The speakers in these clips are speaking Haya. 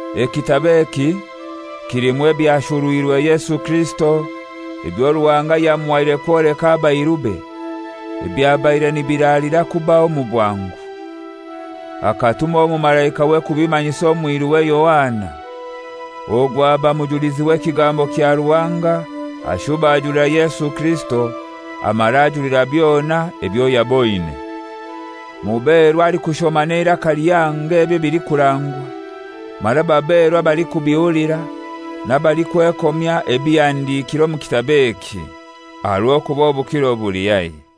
Ekitabo eki kilimu ebyashurwirwe Yesu Kirisito, ebyo Ruhanga yamuhaire kwoleka abairube, ebyabaire nibiralira kubaho omu bwangu. Akatuma omumalaikawe kubimanyisa omwiruwe Yohana. Ogu aba mujulizi w'ekigambo kya Ruhanga, ashuba ajulira Yesu Kirisito, amara ajulira byona ebyo yaboine. Muberwa alikushoma n'eiraka lihango ebi ebilikurangwa, mara baberwa abalikubihulira, n'abalikwekomya ebihandikire omu kitabo eki; aha rw'okuba obukiro buli haihi.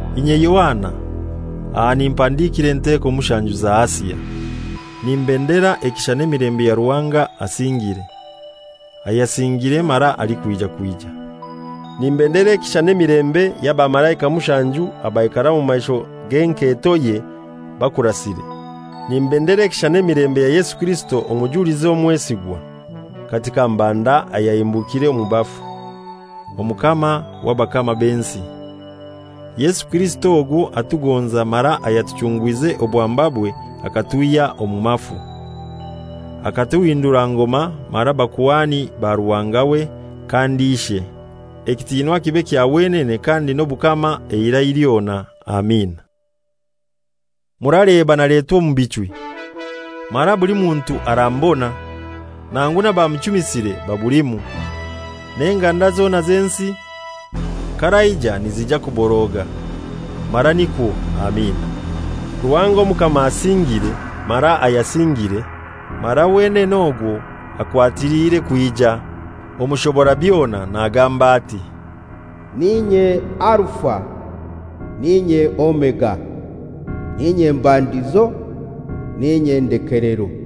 Inye Yohana, aha nimpandikira enteko mushanju za Asia: Nimbendera ekisha n'emilembe ya Ruhanga asingire, ayasingire mara alikwija kwija. Nimbendera ekisha n'emilembe y'abamalaika mushanju abaikara omu maisho g'enketoye bakurasire. Nimbendera ekisha n'emilembe ya Yesu Kirisito omujulizi omwesigwa, kati ka mbanda ayahimbukire omu bafu, Omukama w'abakama b'ensi. Yesu Kirisito ogwo atugonza mara ayatuchungwize obwambabwe akatwihya omu mafu, akatuhindura ngoma mara bakuhani ba Ruhanga we kandi Ishe, ekitinwa kibe kya wenene kandi n'obukama eirai lyona. Amina. Muraleba naletwa omu bichwi, mara buli muntu aramubona, nangu n'abamuchumisire babulimu. N'enganda zona z'ensi k'araija nizija kuboroga. Mara nikwo. Amina. Ruhanga Omukama asingire, mara ayasingire, mara wenene ogwo akwatiliire kwija, Omushobora, byona nagamba ati, «N'inye Alifa, n'inye Omega: N'inye mbandizo, n'inye ndelekero.»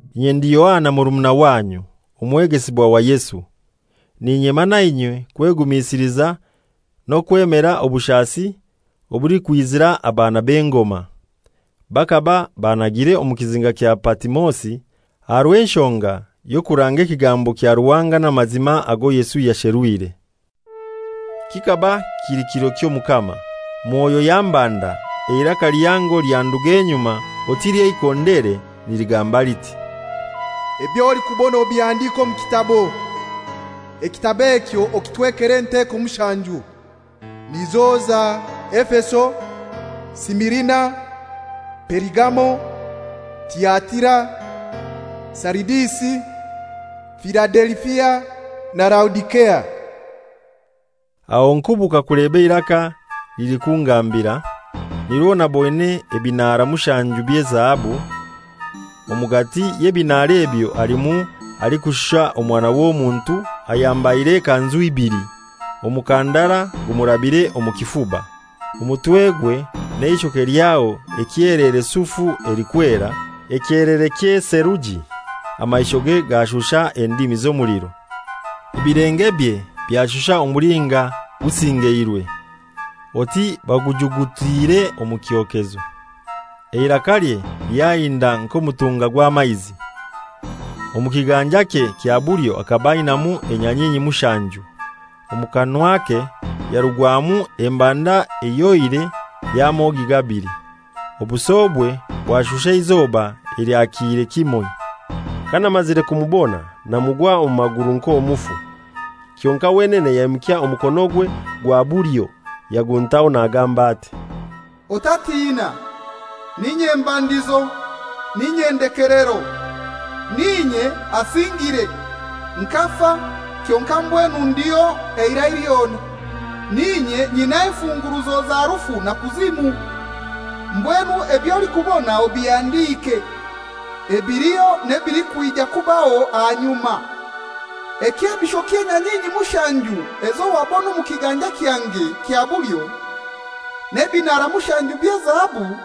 Inye ndi Yohana murumuna wanyu, omwegesibwa wa Yesu, n'inyema nainywe kwegumisiliza n'okwemera obushasi obulikwizira abaana b'engoma. Bakaba bannagire omu Kizinga kya Patimosi aha rw'enshonga y'okuranga ekigambo kya Ruhanga n'amazima ago Yesu yasherwire. Kikaba kili kiro ky'Omukama, Mwoyo yambanda, eiraka lihango lyanduga enyuma oti ly'eikondere, niligamba liti, «Eby'olikubona obihandike omu kitabo, ekitabo ekyo okitwekere enteko mushanju, nizo za: Efeso, Simirina, Perigamo, Tiatira, Saridisi, Filadelifia na Laodisea.» Aho nkubuka kuleba eiraka lilikungambira, nirwo naboine ebinaara mushanju by'ezahabu, omugati y'ebinaara ebyo halimu alikushusha Omwana w'Omuntu, ayambaire ekanzu ibili, omukandara gumurabire omu kifuba. Omutwegwe n'eishoke lyaho ekyelere sufu elikwera, ekyelere ky'eseluji, amaishoge gashusha endimi z'omuliro. Ebilengebye byashusha omulinga gusingeirwe, oti bagujugutiire omu kyokezo, eirakalye lyahinda nk'omutunga gw'amaizi. Omu kiganjakye kya bulyo akaba ainaimu enyanyinyi mushanju, omu kanwake yarugwamu embanda ehyoire ey'amogi gabili, obusobwe bwashusha eizoba elyakiire kimoi. Kanamazire kumubona namugwa omu maguru nk'omufu. Kyonkai wenene yaimukya omukonogwe gwa bulyo yaguntaho nagamba ati, «Otatina, n'inye mbandizo, n'inye ndekelero. N'inye asingire; nkafa, kyonkai mbwenu ndiho eirai lyona. N'inye nyina enfunguruzo za Rufu na Kuzimu. Mbwenu eby'olikubona obihandike: Ebiliho n'ebilikwija kubaho ahanyuma. Ekyebisho ky'enyanyinyi mushanju ezo wabona omu kiganja kyange kya bulyo, n'ebinaara mushanju by'ezahabu: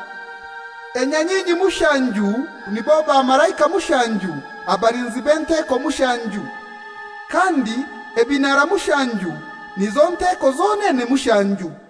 enyanyinyi mushanju nibo bamalaika mushanju abalinzi b'enteko mushanju, kandi ebinaara mushanju nizo nteko zonene mushanju.»